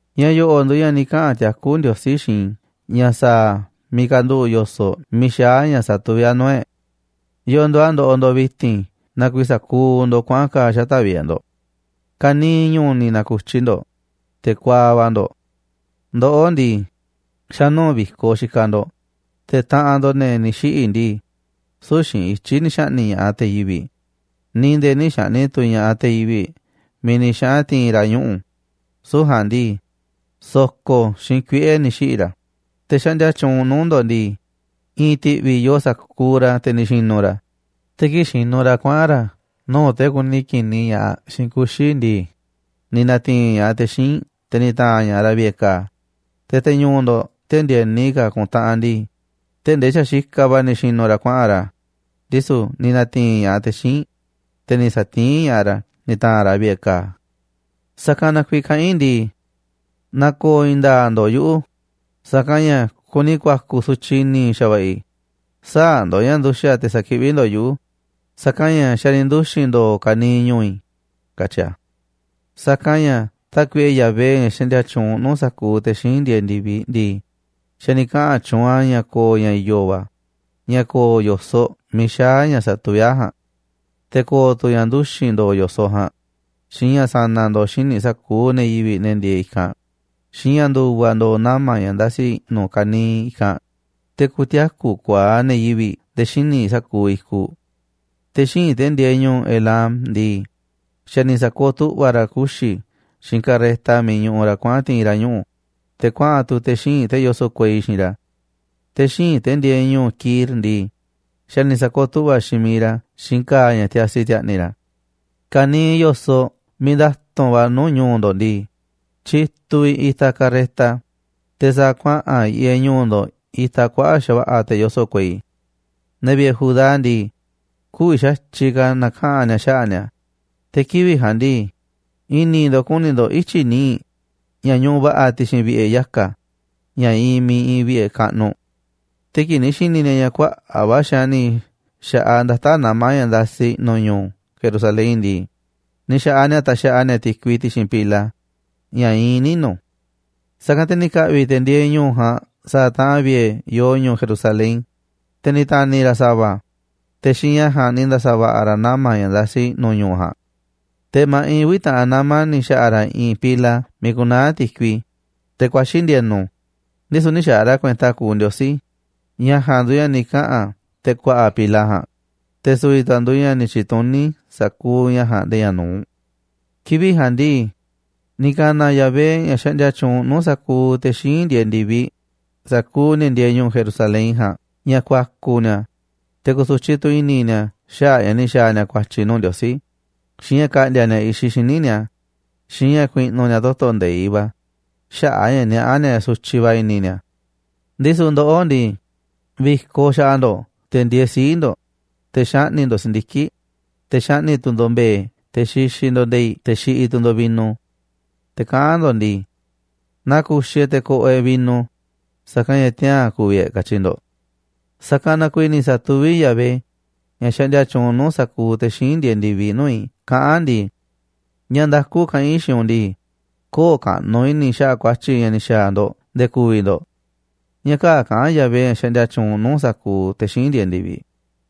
Ña̱ yo̱ꞌo̱ꞌ nduuꞌ ña̱ ni̱ kaꞌa̱n tiakú Ndiosí xiinꞌ i̱ ña̱ sa̱a̱ a̱ miiꞌ kanduꞌu̱ꞌ yo̱soꞌ miiꞌ xaá ña̱ satuví a̱ nuu̱ꞌ e̱ꞌ: ¿Yo̱o̱ nduuꞌ a̱ ndoꞌoꞌ ndo̱ꞌ vi̱ti̱n na kuiiꞌ sa̱kuuꞌ ndo̱ꞌ kuaꞌa̱n ka̱a̱ xata̱ꞌ vi̱ꞌe̱ ndo̱ꞌ? Ka̱niiꞌ ñu̱u̱ ni̱ na̱ku̱tyi ndo̱ꞌ, te̱ kuaaꞌ va̱ ndo̱ꞌ. Ndoꞌó ndii, xa̱ nuu̱ꞌ vi̱koꞌ xikaꞌ ndo̱ꞌ, te̱ taꞌanꞌ ndo̱ꞌ, ne̱ ni̱ xiꞌi̱ ndii, süu̱ꞌ xiinꞌ ityi̱ ni̱ xa̱ꞌni̱ꞌ ña̱ꞌaꞌ te̱ yivi̱ꞌ, ni̱ nde̱e̱ nï̱ xa̱ꞌni̱ꞌ tu̱ ña̱ꞌaꞌ te̱ yivi̱ꞌ miiꞌ ni̱ xaꞌa̱n ti̱i̱n ra̱ ñuꞌu̱, süu̱ꞌ ja̱a̱nꞌ ndii, so̱ko̱ xiinꞌ kuiꞌe̱ ni̱ xiꞌi̱ ra̱. Te̱ xaꞌndia tyuunꞌ nuu̱ꞌ ndo̱ꞌ ndii, i̱i̱n ti̱ꞌvi̱ yoo sa̱kuuꞌ ra̱, te̱ ni̱ xi̱nu̱ ra̱, te̱ kii̱ꞌ xinuꞌ ra̱ kuaꞌa̱n ra̱ nuu̱ꞌ te̱ kuni ki̱niꞌ ña̱ꞌaꞌ xiinꞌ kuxi̱ ndii, ni̱ na̱ti̱i̱n ña̱ꞌaꞌ te̱ xíinꞌ, te̱ ni̱ ta̱a̱n ña̱ꞌaꞌ ra̱ vi̱ꞌe̱ ka̱a̱. Te̱ te̱ ñu̱u̱ ndo̱ꞌ te̱ ndi̱e̱ni ka̱ ku̱ntaꞌanꞌ ndii, tee̱ꞌ ndee xa̱ xikaꞌ va̱ ni̱ xi̱nu̱ ra̱ kuaꞌa̱n ra̱, ndisu̱ ni̱ na̱ti̱i̱n ña̱ꞌaꞌ te̱ xíinꞌ, te̱ ni̱ sa̱tiín ña̱ꞌaꞌ ra̱ ni̱ ta̱a̱nꞌ ra̱ vi̱ꞌe̱ ka̱a̱. Sa̱kanꞌ na kuiiꞌ kaꞌán i̱ ndii: “Na̱ko̱o̱ i̱i̱n nda̱a̱ꞌ ndo̱ꞌ yuꞌu̱, sa̱kanꞌ ña̱ kuni ku̱a̱ku̱ sutyiꞌ i̱ni̱ xa̱va̱ꞌa̱ i̱, sä̱a̱ ndo̱ꞌ ña̱ nduxa̱ꞌ te̱ sa̱kiꞌví ndo̱ꞌ yuꞌu̱, sa̱kanꞌ ña̱ xa̱ ni̱ nduxi̱n ndo̱o̱ kaniiꞌ ñu̱u̱ i̱”, katyi̱ i̱. Sa̱kanꞌ ña̱ Tákuiꞌe Yahvé, ña̱ xaꞌndia tyuunꞌ nuu̱ꞌ sa̱kuuꞌ te̱ xíinꞌ ndieeꞌ ndi̱viꞌ ndii, xa̱ ni̱ kaꞌa̱n tyuunꞌ a̱ ña̱ ko̱o̱ ña̱ i̱yo̱ va̱ ña̱ ko̱o̱ yo̱soꞌ miiꞌ xaá ña̱ satuví a̱ ja̱a̱nꞌ. Te̱ ko̱o̱ tu̱ ña̱ nduxi̱n ndo̱o̱ yo̱soꞌ ja̱a̱nꞌ, xiinꞌ ña̱ sa̱na̱ ndo̱o̱ xíniꞌ sa̱kuuꞌ ne̱ yivi̱ꞌ, ne̱ ndieeꞌ i̱kanꞌ, xiinꞌ ña̱ ndu̱va̱ ndo̱o̱ nama̱ ña̱ ndasi i̱ꞌnu̱ kaniiꞌ i̱kanꞌ, te̱ ku̱tiaku̱ ku̱a̱aꞌ ne̱ yivi̱ꞌ nde̱e̱ xíniꞌ sa̱kuuꞌ i̱kuꞌ. Te̱ xíinꞌ, te̱ ndieeꞌ ñu̱u̱ Elam ndii, xa̱ ni̱ sa̱kooꞌ tu̱ꞌva̱ ra̱ kuxi̱ xiinꞌ karreta miiꞌ ñuꞌuꞌ ra̱ kuaꞌa̱n ti̱i̱n ra̱ ñuꞌu̱, te̱ kuaꞌa̱n tu̱ te̱ xíinꞌ, te̱ yoso̱ꞌ kuei xiinꞌ ra̱. Te̱ xíinꞌ, te̱ ndieeꞌ ñu̱u̱ Kir ndii, xa̱ ni̱ sa̱kooꞌ tu̱ꞌva̱ xiinꞌ miiꞌ ra̱ xiinꞌ ka̱a̱ ña̱ tiasi ti̱a̱ꞌni̱ ra̱. Ka̱niiꞌ yo̱soꞌ miiꞌ nda̱tu̱nꞌ va̱ nuu̱ꞌ ñu̱u̱ ndo̱ꞌ ndii, tyituꞌ vi̱ꞌ itaꞌ kuaꞌa̱ꞌ karreta, te̱ sa̱a̱ kuaꞌa̱n yiꞌeꞌ ñu̱u̱ ndo̱ꞌ itaꞌ kuaꞌa̱ꞌ xa̱va̱ꞌa̱ te̱ yoso̱ꞌ kuei. Ne̱ vi̱ꞌe̱ Judá ndii, kü̱vi̱ xa̱tyiꞌ ka̱ na̱kaꞌa̱n ni̱a̱ xaꞌa̱ꞌ ni̱a̱. Te̱ kivi̱ꞌ ja̱a̱nꞌ ndii, i̱ni̱ ndo̱ꞌ kuni ndo̱ꞌ ityi̱ nii̱ꞌ ña̱ ñuꞌuꞌ va̱ꞌa̱ ti̱xi̱n vi̱ꞌe̱ yaka̱ ña̱ iinꞌ miiꞌ iinꞌ vi̱ꞌe̱ kaꞌnuꞌ. Te̱ kii̱ꞌ ni̱ xi̱ni̱ ni̱a̱ ña̱ kuaꞌa̱ꞌ va̱ xaanꞌ ni̱ xa̱ꞌaꞌ ndata̱ꞌ nama̱ ña̱ ndasi i̱ꞌnu̱ ñu̱u̱ Jerusalén ndii, ni̱ xa̱ꞌaꞌ ni̱a̱ taxaꞌa ni̱a̱ ti̱kui ti̱xi̱n pila ña̱ iinꞌ ninu̱. Sa̱kanꞌ te̱ ni̱ ka̱ꞌvi̱ te̱ ndieeꞌ ñu̱u̱ ja̱a̱nꞌ sa̱a̱ taꞌan vi̱ꞌe̱ yoo ñu̱u̱ Jerusalén, te̱ ni̱ ta̱ni̱ ra̱ sa̱va̱ a̱, te̱ xiinꞌ ña̱ ja̱a̱nꞌ ni̱ nda̱sa̱ va̱ꞌa̱ ra̱ nama̱ ña̱ ndasi i̱ꞌnu̱ ñu̱u̱ ja̱a̱nꞌ. Te̱ ma̱ꞌiꞌ uvi̱ taꞌan nama̱ ni̱ xa̱ꞌa̱ ra̱ i̱i̱n pila miiꞌ ku̱naa̱ ti̱kui, teꞌ ku̱a̱xi̱ ndi̱e̱nu̱, ndisu̱ nï̱ xaaꞌ ra̱ kuenta kuuꞌ Ndiosí. Ña̱ ja̱a̱nꞌ nduuꞌ ña̱ ni̱ kaꞌa̱n te̱ ku̱a̱ꞌa̱ pila ja̱a̱nꞌ, te̱ su̱vi̱ tu̱ a̱ nduuꞌ ña̱ ni̱ tyi̱tuní sa̱kuuꞌ ña̱ ja̱a̱nꞌ nde̱e̱ ña̱ nu̱uꞌ. Kivi̱ꞌ ja̱a̱nꞌ ndii, ni̱ ka̱na̱ Yahvé, ña̱ xaꞌndia tyuunꞌ nuu̱ꞌ sa̱kuuꞌ te̱ xíinꞌ ndieeꞌ ndi̱viꞌ, sa̱kuuꞌ ne̱ ndieeꞌ ñu̱u̱ Jerusalén ja̱a̱nꞌ ña̱ ku̱a̱ku̱ ni̱a̱, te̱ ku̱su̱tyiꞌ tu̱ i̱ni̱ ni̱a̱ xaꞌa̱ꞌ a̱ ña̱ ni̱ xa̱a̱ ni̱a̱ ku̱a̱tyi̱ nuu̱ꞌ Ndiosí, xiinꞌ ña̱ ka̱ꞌndi̱a̱ ni̱a̱ i̱xiꞌ xíniꞌ ni̱a̱, xiinꞌ ña̱ ku̱i̱ꞌnu̱ ni̱a̱ toto̱ nde̱iꞌ va̱ xaꞌa̱ꞌ a̱ ña̱ niaꞌá ni̱a̱ ña̱ sutyiꞌ va̱ i̱ni̱ ni̱a̱. Ndisu̱ ndoꞌó ndii, vi̱koꞌ xaꞌa ndo̱ꞌ, te̱ ndieeꞌ sii̱ꞌ ndo̱ꞌ, te̱ xaꞌni̱ꞌ ndo̱ꞌ si̱ndiki̱ꞌ, te̱ xaꞌni̱ꞌ tu̱ ndo̱ꞌ mbe̱e̱, te̱ xixiꞌ ndo̱ꞌ nde̱i̱ꞌ, te̱ xiꞌiꞌ tu̱ ndo̱ꞌ vino. Te̱ kaꞌán ndo̱ꞌ ndii: “Na ku̱xi̱ e̱ꞌ te̱ ko̱ꞌo̱ e̱ꞌ vino, sa̱kanꞌ ña̱ tiaa̱n ku̱vi̱ e̱ꞌ”, katyi ndo̱ꞌ. Sa̱kanꞌ na kuiiꞌ ni̱ sa̱tuví Yahvé, ña̱ xaꞌndia tyuunꞌ nuu̱ꞌ sa̱kuuꞌ te̱ xíinꞌ ndieeꞌ ndi̱viꞌ, nuu̱ꞌ i̱ kaꞌán a̱ ndii: “Ña̱ nda̱ku kaꞌán i̱ xiinꞌ u̱nꞌ ndii, köo̱ꞌ kaꞌnuꞌ i̱ni̱ i̱ xaꞌa̱ꞌ ku̱a̱tyi̱ ña̱ ni̱ xa̱a̱ ndo̱ꞌ nde̱e̱ ku̱vi̱ ndo̱ꞌ.” Ña̱ kaa̱ꞌ kaꞌán Yahvé, ña̱ xaꞌndia tyuunꞌ nuu̱ꞌ sa̱kuuꞌ te̱ xíinꞌ ndieeꞌ ndi̱viꞌ.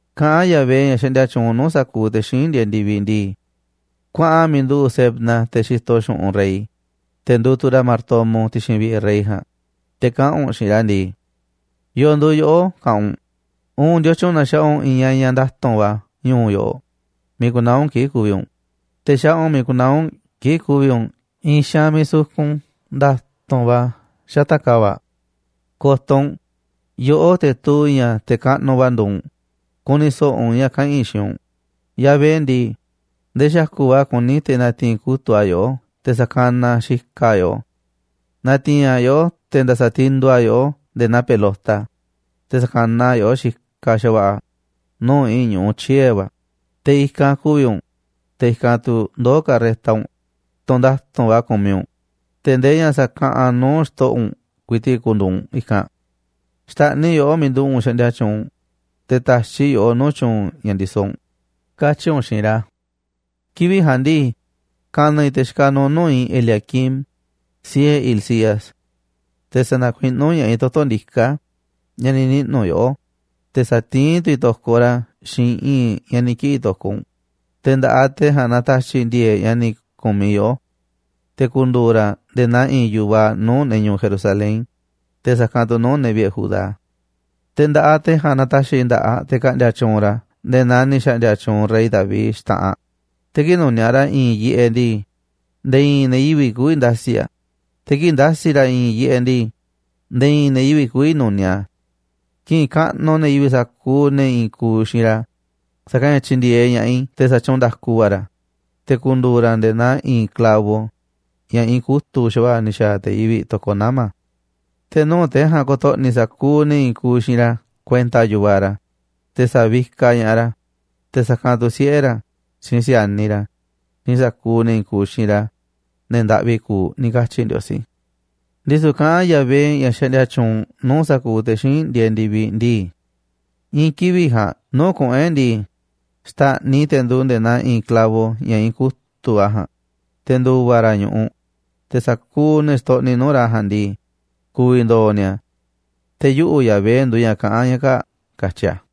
Kaꞌán Yahvé, ña̱ xaꞌndia tyuunꞌ nuu̱ꞌ sa̱kuuꞌ te̱ xíinꞌ ndieeꞌ ndi̱viꞌ ndii: “Kuaꞌan miiꞌ nduꞌu̱ Sebna, te̱ xitoꞌ xu̱ꞌunꞌ rey, te̱ nduuꞌ tu̱ ra̱ martomo ti̱xi̱n vi̱ꞌe̱ rey ja̱a̱nꞌ, te̱ kaꞌa̱n u̱nꞌ xiinꞌ ra̱ ndii: ¿Yo̱o̱ nduuꞌ yoꞌó, kaꞌanꞌ u̱nꞌ, uun ndiotyun na xaꞌa u̱nꞌ i̱i̱n ñañaꞌ nda̱tu̱nꞌ va̱ ñu̱u̱ yoꞌoꞌ, miiꞌ ku̱naa̱ u̱nꞌ kii̱ꞌ ku̱vi̱ u̱nꞌ, te̱ xaꞌa u̱nꞌ miiꞌ ku̱naa̱ u̱nꞌ kii̱ꞌ ku̱vi̱ u̱nꞌ i̱i̱n xaanꞌ miiꞌ sukun nda̱tu̱nꞌ va̱ xata̱ꞌ ka̱va̱ꞌ? Ko̱to̱ u̱nꞌ, yoꞌó, te̱ tuu ña̱ te̱ kaꞌnuꞌ va̱ nduuꞌ u̱nꞌ, ku̱ni̱ so̱ꞌo̱ u̱nꞌ ña̱ kaꞌa̱n i̱ xiinꞌ u̱nꞌ. Yahvé ndii, ndee xa̱ku̱ꞌ va̱ kuní te̱ na̱ti̱i̱n kutu̱ꞌ a̱ yoꞌó te̱ sa̱kanaꞌ a̱ xikaꞌ a̱ yoꞌó. Na̱ti̱i̱n a̱ yoꞌó te̱ nda̱sa̱ tinduꞌ a̱ yoꞌó nde̱e̱ naa pelota, te̱ sa̱kanaꞌ yoꞌó xikaꞌ xa̱va̱ꞌa̱ nuu̱ꞌ i̱i̱n ñu̱ꞌuꞌ tyiee̱ va̱, te̱ i̱kanꞌ ku̱vi̱ u̱nꞌ, te̱ i̱kanꞌ tu̱ ndoo̱ karreta u̱nꞌ, tunꞌ nda̱tu̱nꞌ va̱ kumiꞌ u̱nꞌ, te̱ ndee ña̱ sa̱kaꞌanꞌ nuu̱ꞌ xto̱ꞌo̱ u̱nꞌ ku̱i̱ti̱ꞌ ku̱ndu̱u̱ u̱nꞌ i̱kanꞌ. Xta̱ꞌniꞌ i̱ yoꞌó miiꞌ nduꞌu̱ꞌ u̱nꞌ xaꞌndia tyuunꞌ u̱nꞌ, te̱ ta̱xiꞌ i̱ yoꞌó nuu̱ꞌ tyu̱u̱n ña̱ ndisoꞌ u̱nꞌ, katyi̱ u̱nꞌ xiinꞌ ra̱. ’Kivi̱ꞌ ja̱a̱nꞌ ndii, ka̱na̱ i̱ te̱ xikaꞌ nuuꞌ nuu̱ꞌ i̱ Eliaquim, siꞌe̱ Hilcías. Te̱ sa̱na̱kuiꞌnú ña̱ꞌaꞌ i̱ toto̱ ndiká ña̱ ni̱ niꞌnu̱ yoꞌó, te̱ sa̱tiín tu̱ i̱ to̱koꞌ ra̱ xiinꞌ i̱i̱nꞌ ña̱ ni̱ ki̱ꞌi̱ to̱koꞌ u̱nꞌ, te̱ nda̱ꞌaꞌ te̱ ja̱a̱nꞌ na̱ta̱xi̱ i̱ ndi̱e̱e̱ꞌ ña̱ ni̱ ku̱miꞌ yoꞌó. Te̱ ku̱ndu̱u̱ ra̱ nde̱e̱ naa i̱i̱n yu̱vaꞌ nuu̱ꞌ ne̱ ñu̱u̱ Jerusalén, te̱ sa̱kanꞌ tu̱ nuu̱ꞌ ne̱ vi̱ꞌe̱ Judá. Te̱ nda̱ꞌaꞌ te̱ ja̱a̱nꞌ na̱ta̱xi̱ i̱ nda̱ꞌaꞌ te̱ ka̱ꞌndi̱a̱ tyuunꞌ ra̱ nde̱e̱ naa ni̱ xa̱ꞌndi̱a̱ tyuunꞌ rey David xta̱ꞌanꞌ, te̱ kii̱ꞌ nu̱niaꞌ ra̱ i̱i̱n yiꞌeꞌ ndii, nde̱e̱ i̱i̱n ne̱ yivi̱ꞌ kü̱vi̱ nda̱si̱ a̱, te̱ kii̱ꞌ nda̱si̱ ra̱ i̱i̱n yiꞌeꞌ ndii, nde̱e̱ i̱i̱n ne̱ yivi̱ꞌ kü̱vi̱ nu̱niaꞌ a̱. Ki̱ꞌi̱n kaꞌnuꞌ ne̱ yivi̱ꞌ sa̱kuuꞌ ne̱ i̱i̱n kuuꞌ xiinꞌ ra̱, sa̱kanꞌ ña̱ tyi̱ndi̱e̱eꞌ ña̱ꞌaꞌ i̱ te̱ sa̱tyuunꞌ nda̱ku va̱ ra̱, te̱ ku̱ndu̱u̱ ra̱ nde̱e̱ naa i̱i̱n clavo ña̱ iinꞌ kutu̱ꞌ xa̱va̱ꞌa̱ ni̱ xa̱a̱ te̱ yivi̱ꞌ to̱koꞌ nama̱. Te̱ nuu̱ꞌ te̱ ja̱a̱nꞌ ko̱to̱ꞌni̱ sa̱kuuꞌ ne̱ i̱i̱n kuuꞌ xiinꞌ ra̱ kuenta yu̱vaꞌ ra̱, te̱ sa̱vikaꞌ ña̱ꞌaꞌ ra̱, te̱ sa̱kanꞌ tu̱ siꞌe̱ ra̱, xiinꞌ si̱a̱niꞌ ra̱ xiinꞌ sa̱kuuꞌ ne̱ i̱i̱n kuuꞌ xiinꞌ ra̱, ne̱ ndaꞌvi kuuꞌ”, ni̱ katyi Ndiosí. Ndisu̱ kaꞌán Yahvé, ña̱ xaꞌndia tyuunꞌ nuu̱ꞌ sa̱kuuꞌ te̱ xíinꞌ ndieeꞌ ndi̱viꞌ ndii: “I̱i̱n kivi̱ꞌ ja̱a̱nꞌ nuu̱ꞌ kuꞌu̱n e̱ꞌ ndii, xta̱ꞌniꞌ i̱ te̱ nduuꞌ nde̱e̱ naa i̱i̱n clavo ña̱ iinꞌ kutu̱ꞌ va̱ ja̱a̱nꞌ, te̱ ndu̱va̱ ra̱ ñu̱ꞌuꞌ. Te̱ sa̱kuuꞌ ne̱ xtoꞌniꞌ nuu̱ꞌ ra̱ ja̱a̱nꞌ ndii, ku̱vi̱ ndo̱o̱ ni̱a̱. Te̱ yuꞌu̱, Yahvé, nduuꞌ ña̱ kaꞌán ña̱ kaa̱ꞌ”, katyi a̱.